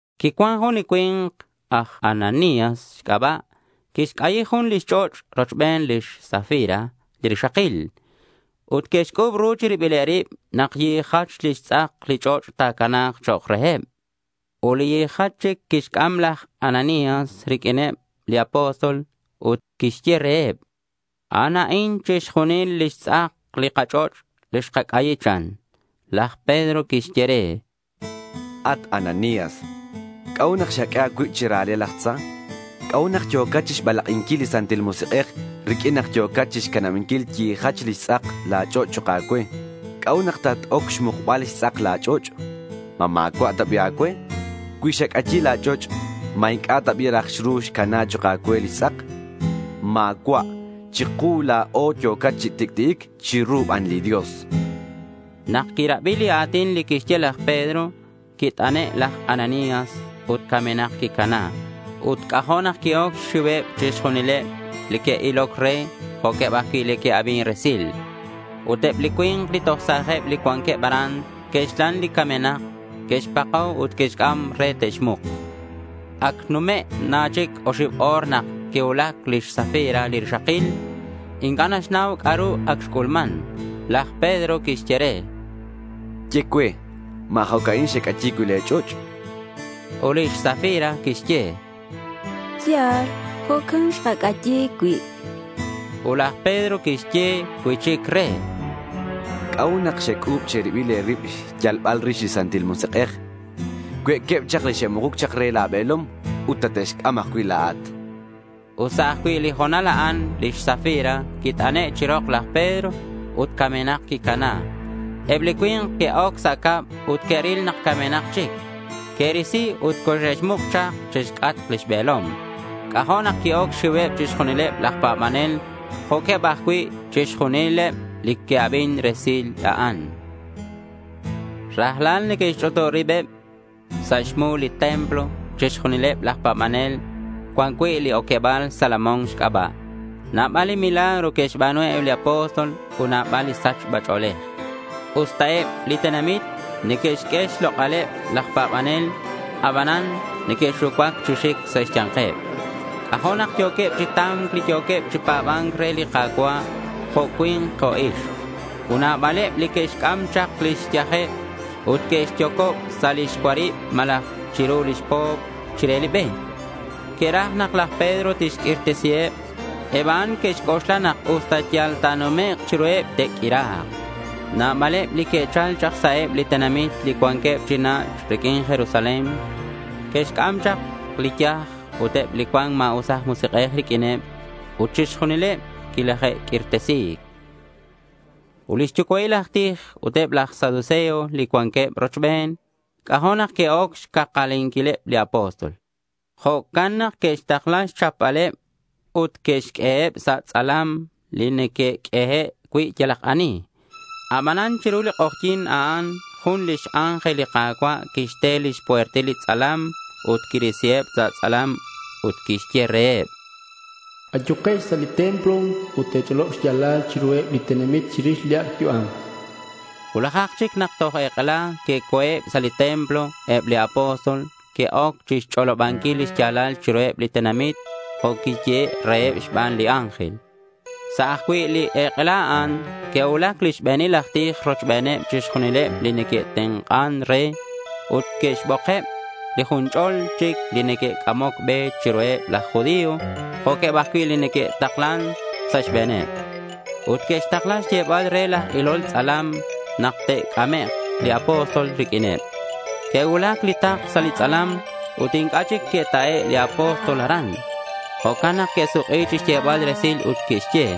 Quicuan jun li cui̱nk aj Ananías xc'aba'. Quixc'ayi jun lix ch'och' rochben lix Safira li rixakil. Ut que'xc'u̱b ru chi ribileb rib nak yijach lix tz'ak li ch'och' ta̱cana̱k chok' reheb. Ut li yijach chic quixc'am laj Ananías riq'uineb li apóstol ut quixye reheb: —A'an a'in chixjunil lix tz'ak li kach'och' li xkac'ayi, chan. Laj Pedro quixye re: —At Ananías, ¿c'a'ut nak xaq'ue a̱cuib chira̱le laj tza? ¿C'a'ut nak yo̱cat chixbalak'inquil li Santil Musik'ej riq'uin nak yo̱cat chixcanabanquil yijach lix tz'ak li ch'och' chok' a̱cue? ¿C'a'ut nak tat-oc xmukbal xtz'ak la̱ ch'och'? ¿Ma ma̱cua' ta bi' a̱cue? Cui xac'ayi la̱ ch'och', ¿ma inc'a' ta bi' raj xru xcana chok' a̱cue lix tz'ak? Ma̱cua' chiku la̱o yo̱cat chi tic'ti'ic. Chiru ban li Dios, chan. Nak quirabi li a̱tin li quixye laj Pedro, quit'ane' laj Ananías ut camenak quicana. Ut c'ajo' nak qui-oc xxiuheb chixjunileb li que'iloc re jo'queb ajcui' li que'abin resil. Ut eb li cui̱nk li toj sa̱jeb li cuanqueb aran que'xlan li camenak, que'xpako ut que'xc'am re te'xmuk. Ac xnume' na chic oxib o̱r nak quicuulac lix Safira li rixakil. Inc'a' naxnau c'a'ru ac xc'ulman. Laj Pedro quixye re: —Ye cue. ¿Ma jo' a'in xec'ayi cui' le̱ ch'och'?— Ut lix Safira quixye: —Ya̱l, jo'can xkac'ayi cui', chan. Ut laj Pedro quixye cui'chic re: —¿C'a'ut nak xec'u̱b che̱ribil e̱rib xyalbal rix li Santil Musik'ej? Cue'queb chak li xe'mukuc chak re la̱ be̱lom ut tate'xc'am ajcui' la̱at, chan. Ut sa' ajcui' li ho̱nal a'an lix Safira quit'ane' chi rok laj Pedro ut camenak quicana. Eb li cui̱nk que'oc sa' cab ut que'ril nak camenak chic. Que'risi ut coxe'xmuk chak chixc'atk lix be̱lom. C'ajo' nak qui-oc xxiuheb chixjunileb laj pa̱banel jo'queb ajcui' chixjunileb li que'abin re li resil a'in. Rajlal neque'xch'utub ribeb sa' xmu li templo chixjunileb laj pa̱banel cuan cui' li oqueba̱l Salomón xc'aba'. Nabal li milagro que'xba̱nu eb li apóstol ut nabal li sachba ch'o̱lej. Usta eb li tenamit neque'xq'ue xlok'aleb laj pa̱banel, abanan neque'xucuac chi xic sa' xya̱nkeb. C'ajo' nak yo̱queb chi ta̱mc li yo̱queb chi pa̱ba̱nc re li Ka̱cua', jo' cui̱nk jo' ixk. Ut nabaleb li que'xc'am chak lix yajeb ut que'xyocob sa' lix cuarib malaj chiru lix po̱p chire be. Que'raj nak laj Pedro tixq'uirtesiheb. Eb a'an que'xc'oxla nak usta yal ta̱numek' chiruheb, te'q'uira̱k. Nabaleb li que'chal chak sa' eb li tenamit li cuanqueb chi nach' riq'uin Jerusalén. Que'xc'am chak li yaj ut eb li cuan ma̱us aj Musik'ej riq'uineb. Ut chixjunileb quilaje'q'uirtesi̱c. Ut li xyucua'il aj tij ut eb laj saduceo li cuanqueb rochben, c'ajo' nak que'oc xcakalinquileb li apóstol. Jo'can nak que'xtakla xchapbaleb ut que'xq'ueheb sa' li tz'alam li neque'q'uehe' cui' yalak ani. Abanan chiru li k'ojyi̱n a'an jun lix ángel li Ka̱cua' quixte lix puertil li tz'alam ut quirisiheb sa' tz'alam ut quixye reheb: —Ayukex sa' li templo ut te̱ch'olob xya̱lal chiruheb li tenamit chirix li ac' yu'am, chan reheb. Cuulajak chic nak toj ek'ela que'co̱eb sa' li templo eb li apóstol ut que'oc chixch'olobanquil li xya̱lal chiruheb li tenamit jo' quiyehe' reheb xban li ángel. Sa' ajcui' li ek'ela a'an que'cuulac li xbe̱nil aj tij rochbeneb chixjunileb li neque'tenk'an re, ut que'xbokeb li jun ch'ol chic li neque'c'amoc be chiruheb laj judío jo'queb ajcui' li neque'taklan sa' xbe̱neb. Ut que'xtakla xyebal re laj ilol tz'alam nak te'c'amek' li apóstol riq'uineb. Que'cuulac li takl sa' li tz'alam ut inc'a' chic que'ta'e' li apóstol aran. Jo'can nak que'suk'i chixyebal resil ut que'xye: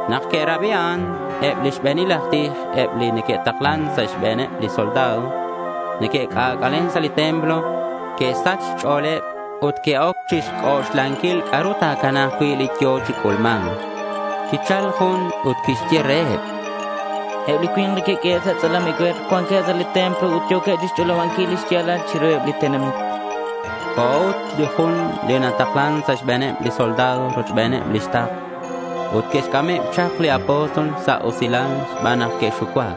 Nak que'rabi a'an, eb li xbe̱nil aj tij ut eb li neque'taklan sa' xbe̱neb li soldado li neque'c'ac'alen sa' li templo, que'sach xch'o̱leb ut que'oc chixc'oxlanquil c'a'ru ta̱cana̱k cui' li yo̱ chi c'ulma̱nc. Quichal jun ut quixye reheb: —Eb li cui̱nk li que'q'uehe' sa' tz'alam ecue̱r cuanqueb sa' li templo ut yo̱queb chixch'olobanquil li xya̱lal chiruheb li tenamit, chan. Co̱ ut li jun li nataklan sa' xbe̱neb li soldado rochbeneb lix takl. Ut que'xc'ameb chak li apóstol sa' usilal xban nak que'xucuac.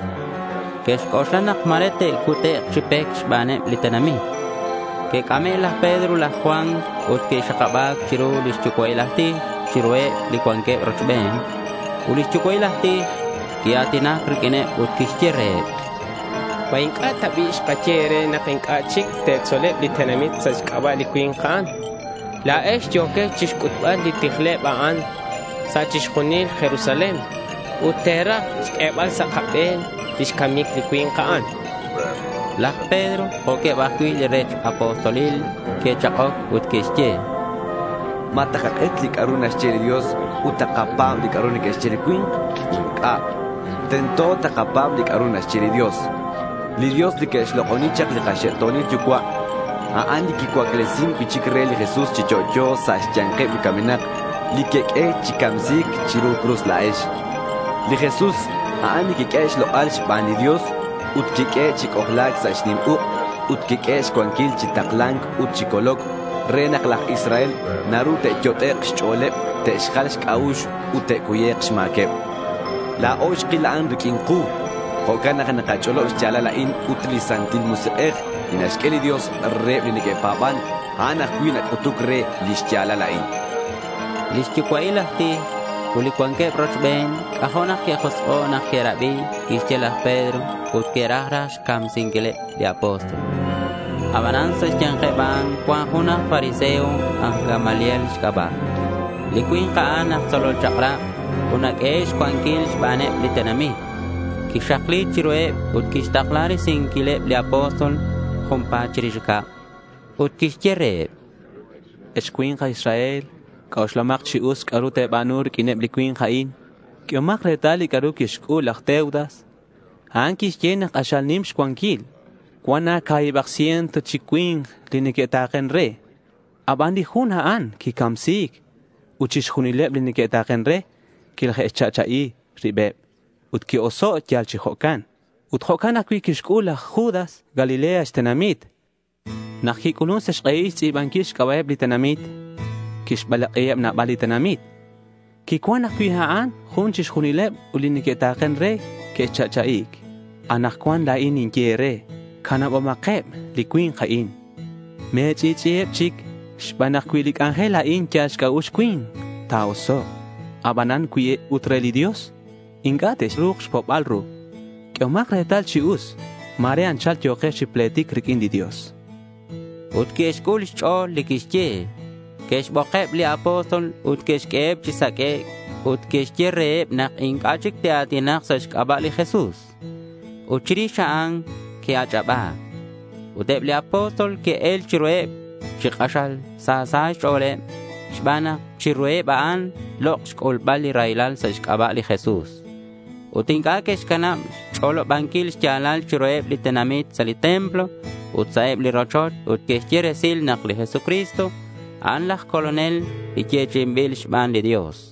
Que'xc'oxla nak ma̱re te'cutek' chi pec xbaneb li tenamit. Que'c'ame' laj Pedro ut laj Juan ut que'xakaba̱c chiru li xyucua'il aj tij ut chiruheb li cuanqueb rochben. Ut li xyucua'il aj tij quia̱tinac riq'uineb ut quixye reheb: —¿Ma inc'a' ta bi' xkaye e̱re nak inc'a' chic te̱tzoleb li tenamit sa' xc'aba' li cui̱nk a'an? La̱ex yo̱quex chixc'utbal li tijleb a'an sa' chixjunil Jerusalén ut te̱raj xq'uebal sa' kabe̱n lix camic li cui̱nk a'an, chanqueb. Laj Pedro, jo'queb ajcui' li rech apostolil, que'chak'oc ut que'xye: —¿Ma takak'et li c'a'ru naxye li Dios ut takapa̱b li c'a'ru neque'xye li cui̱nk? Inc'a'. Tento takapa̱b li c'a'ru naxye li Dios. Li Dios li que'xlok'oni chak li kaxe'to̱nil yucua', a'an li quicuaclesin cui'chic re li Jesús chi yo'yo sa' xya̱nkeb li camenak, li queq'ue chi camsi̱c chiru cruz la̱ex. Li Jesús, a'an li quiq'uehe' xlok'al xban li Dios ut quiq'uehe' chi c'ojla̱c sa' xnim uk' ut quiq'uehe' xcuanquil chi takla̱nc ut chi coloc, re nak laj Israel naru te'yot'ek' xch'o̱leb te'xjal xc'a'ux ut te'cuyek' xma̱queb. La̱o xkil a'an riq'uin ku. Jo'can nak nakach'olob xya̱lal a'in ut li Santil Musik'ej li naxq'ue li Dios reheb li neque'pa̱ban, a'an ajcui' nac'utuc re li xya̱lal a'in, chanqueb. Li xyucua'il aj tij ut li cuanqueb rochben, c'ajo' nak que'josk'o' nak que'rabi li quixye laj Pedro ut que'raj raj xcamsinquileb li apóstol. Abanan sa' xya̱nkeb a'an cuan jun aj fariseo aj Gamaliel xc'aba'. Li cui̱nk a'an aj tzolol chak'rab ut naq'uehe' xcuanquil xbaneb li tenamit. Quixakli chiruheb ut quixtakla risinquileb li apóstol junpa̱t chirix cab. Ut quixye reheb: —Ex cui̱nk aj Israel, c'oxlahomak chi us c'a'ru te̱ba̱nu riq'uineb li cui̱nk a'in. Q'uehomak retal li c'a'ru quixc'ul laj Teudas. A'an quixye nak k'axal nim xcuanquil. Cuan na ca̱hibak ciento chi cui̱nk li neque'ta̱ken re. Aban li jun a'an quicamsi̱c ut chixjunileb li que'ta̱ken re quilaje'xcha'cha'i ribeb ut que'oso' yal chi jo'can. Ut jo'can ajcui' quixc'ul laj Judas, Galilea xtenamit, nak quic'ulun sa' xk'ehil chixtz'i̱banquil xc'aba'eb li tenamit. Quixbalak'iheb nabaleb li tenamit. Quicam ajcui' a'an ut chixjunileb li que'ta̱ken re que'cha'cha'i̱c. Anakcuan la̱in tinye e̱re: Canabomakeb li cui̱nk a'in. Me̱ch'i'ch'i'iheb chic xban nak cui li c'anjel a'in yal xc'a'ux cui̱nk, ta̱osok'. Abanan cui ut re li Dios, inc'a' texru̱k chixpo'bal ru. Q'uehomak retal chi us ma̱re anchal yo̱quex chi pletic riq'uin li Dios, chan laj Gamaliel. Ut que'xc'ul xch'o̱l li quixye. Que'xbokeb li apóstol ut que'xq'ueheb chi saq'uec' ut que'xye reheb nak inc'a' chic te'a̱tinak sa' xc'aba' li Jesús. Ut chirix a'an, que'ach'aba̱c. Ut eb li apóstol que'el chiruheb chi k'axal sa sa' xch'o̱leb xban nak chiruheb a'an lok' xc'ulbal li raylal sa' xc'aba' li Jesús. Ut inc'a' que'xcanab xch'olobanquil xya̱lal chiruheb li tenamit sa' li templo ut sa' eb li rochoch ut que'xye resil nak li Jesucristo, a'an laj Colonel li yechi'inbil xban li Dios.